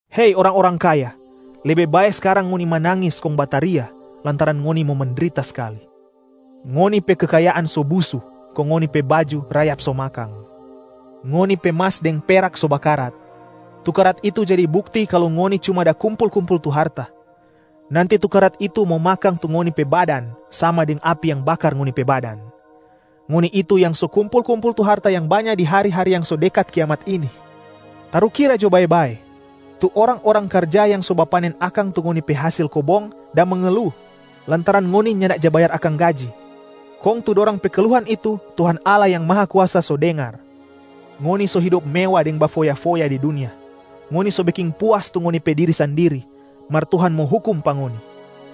Hei orang-orang kaya, lebe bae skarang ngoni manangis kong bataria lantaran ngoni mo mendrita skali. Ngoni pe kekayaan so busu kong ngoni pe baju rayap so makang. Ngoni pe mas deng perak so bakarat. Tu karat itu jadi bukti kalu ngoni cuma da kumpul-kumpul tu harta. Nanti tu karat itu mo makang tu ngoni pe badan sama deng api yang bakar ngoni pe badan. Ngoni itu yang so kumpul-kumpul tu harta yang banya di hari-hari yang so dekat kiamat ini. Tarukira jo bae-bae, tu orang-orang karja yang so bapanen akang tu ngoni pe hasil kobong da mengelu lantaran ngoni nyanda ja bayar akang gaji. Kong tu dorang pe keluhan itu Tuhan Allah Yang Mahakuasa so dengar. Ngoni so hidop mewa deng bafoya-foya di dunia. Ngoni so beking puas tu ngoni pe diri sandiri, mar Tuhan mo hukum pa ngoni.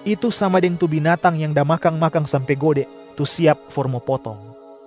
Itu sama deng tu binatang yang da makang-makang sampe gode, tu siap for mo potong.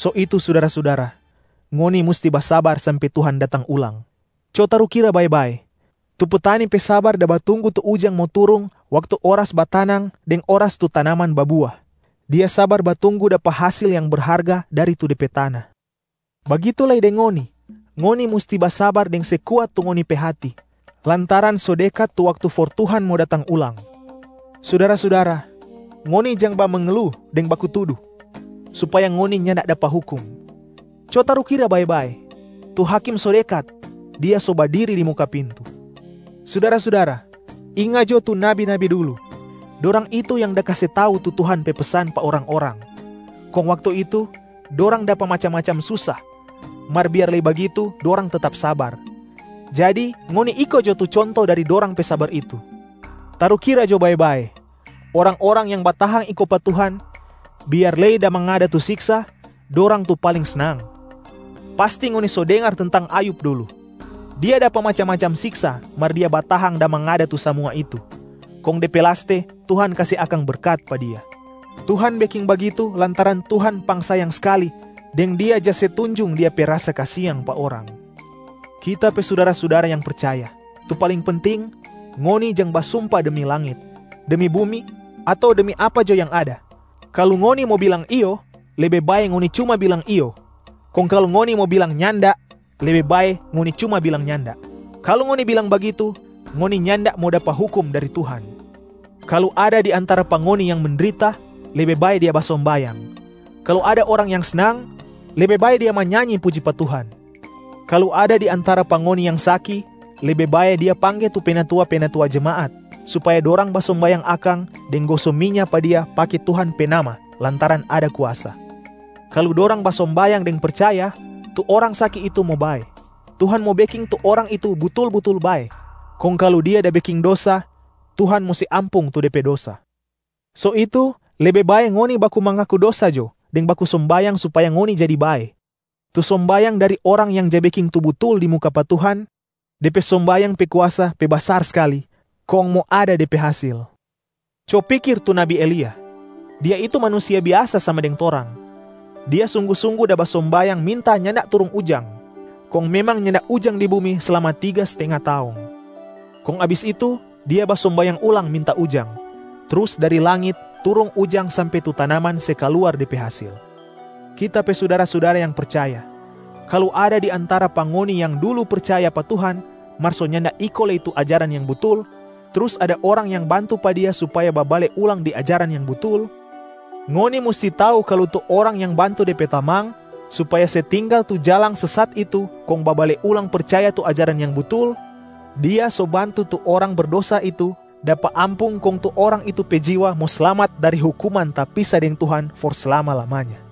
So itu sudara-sudara, ngoni musti basabar sampe Tuhan datang ulang. Co tarukira bae-bae, tu petani pe sabar da batunggu tu ujang mo turung waktu oras batanang deng oras tu tanaman babua. Dia sabar batunggu dapa hasil yang berharga dari tu de pe tana. Bagitu lei deng ngoni, ngoni musti basabar deng se kuat tu ngoni pe hati, lantaran so dekat tu waktu for Tuhan mo datang ulang. Sudara-sudara, ngoni jang bamengelu deng baku tudu, supaya ngoni nyanda dapa hukum. Co tarukira bae-bae, tu Hakim so dekat, Dia so badiri di muka pintu. Sudara-sudara, inga jo tu nabi-nabi dulu, dorang itu yang da kase tau tu Tuhan pe pesan pa orang-orang. Kong waktu itu, dorang dapa macam-macam susa, mar biar lei bagitu dorang tetap sabar. Jadi ngoni iko jo tu conto dari dorang pe sabar itu. Tarukira jo bae-bae, orang-orang yang batahang iko pa Tuhan biar lei da mangada tu siksa, dorang tu paling snang. Pasti ngoni so dengar tentang Ayub dulu. Dia dapa macam-macam siksa mar dia batahang da mangada tu samua itu, kong de pe laste Tuhan kase akang berkat pa dia. Tuhan beking bagitu lantaran Tuhan pangsayang skali deng Dia ja se tunjung Dia pe rasa kasiang pa orang. Kita pe sudara-sudara yang percaya, tu paling penting, ngoni jang basumpa demi langit, demi bumi ato demi apa jo yang ada. Kalu ngoni mo bilang “iyo,” lebe bae ngoni cuma bilang “iyo.” Kong kalu ngoni mo bilang “nyanda,” lebe bae ngoni cuma bilang “nyanda.” Kalu ngoni bilang bagitu, ngoni nyanda mo dapa hukum dari Tuhan. Kalu ada di antara pa ngoni yang mendrita, lebe bae dia basombayang. Kalu ada orang yang snang, lebe bae dia manyanyi puji pa Tuhan. Kalu ada di antara pa ngoni yang saki, lebe bae dia pangge tu penatua-penatua jemaat, supaya dorang basombayang akang deng goso minya pa dia pake Tuhan pe Nama lantaran ada kuasa. Kalu dorang basombayang deng percaya, tu orang saki itu mo bae. Tuhan mo beking tu orang itu butul-butul bae. Kong kalu dia da beking dosa, Tuhan mo se ampung tu de pe dosa. So itu lebe bae ngoni baku mangaku dosa jo deng baku sombayang supaya ngoni jadi bae. Tu sombayang dari orang yang ja beking tu butul di muka pa Tuhan, de pe sombayang pe kuasa pe basar skali kong mo ada de pe hasil. Co pikir tu nabi Elia! Dia itu manusia biasa sama deng torang. Dia sunggu-sunggu da basombayang minta nyanda turung ujang, kong memang nyanda ujang di bumi slama tiga stenga taong. Kong abis itu dia basombayang ulang minta ujang, trus dari langit turung ujang sampe tu tanaman se kaluar de pe hasil. Kita pe sudara-sudara yang percaya, kalu ada di antara pa ngoni yang dulu percaya pa Tuhan mar so nyanda iko lei tu ajaran yang butul, trus ada orang yang bantu pa dia supaya babale ulang di ajaran yang butul, ngoni musti tau kalu tu orang yang bantu de pe tamang supaya se tinggal tu jalang sesat itu kong babale ulang percaya tu ajaran yang butul, dia so bantu tu orang berdosa itu dapa ampung kong tu orang itu pe jiwa mo slamat dari hukuman tapisa deng Tuhan for slama-lamanya.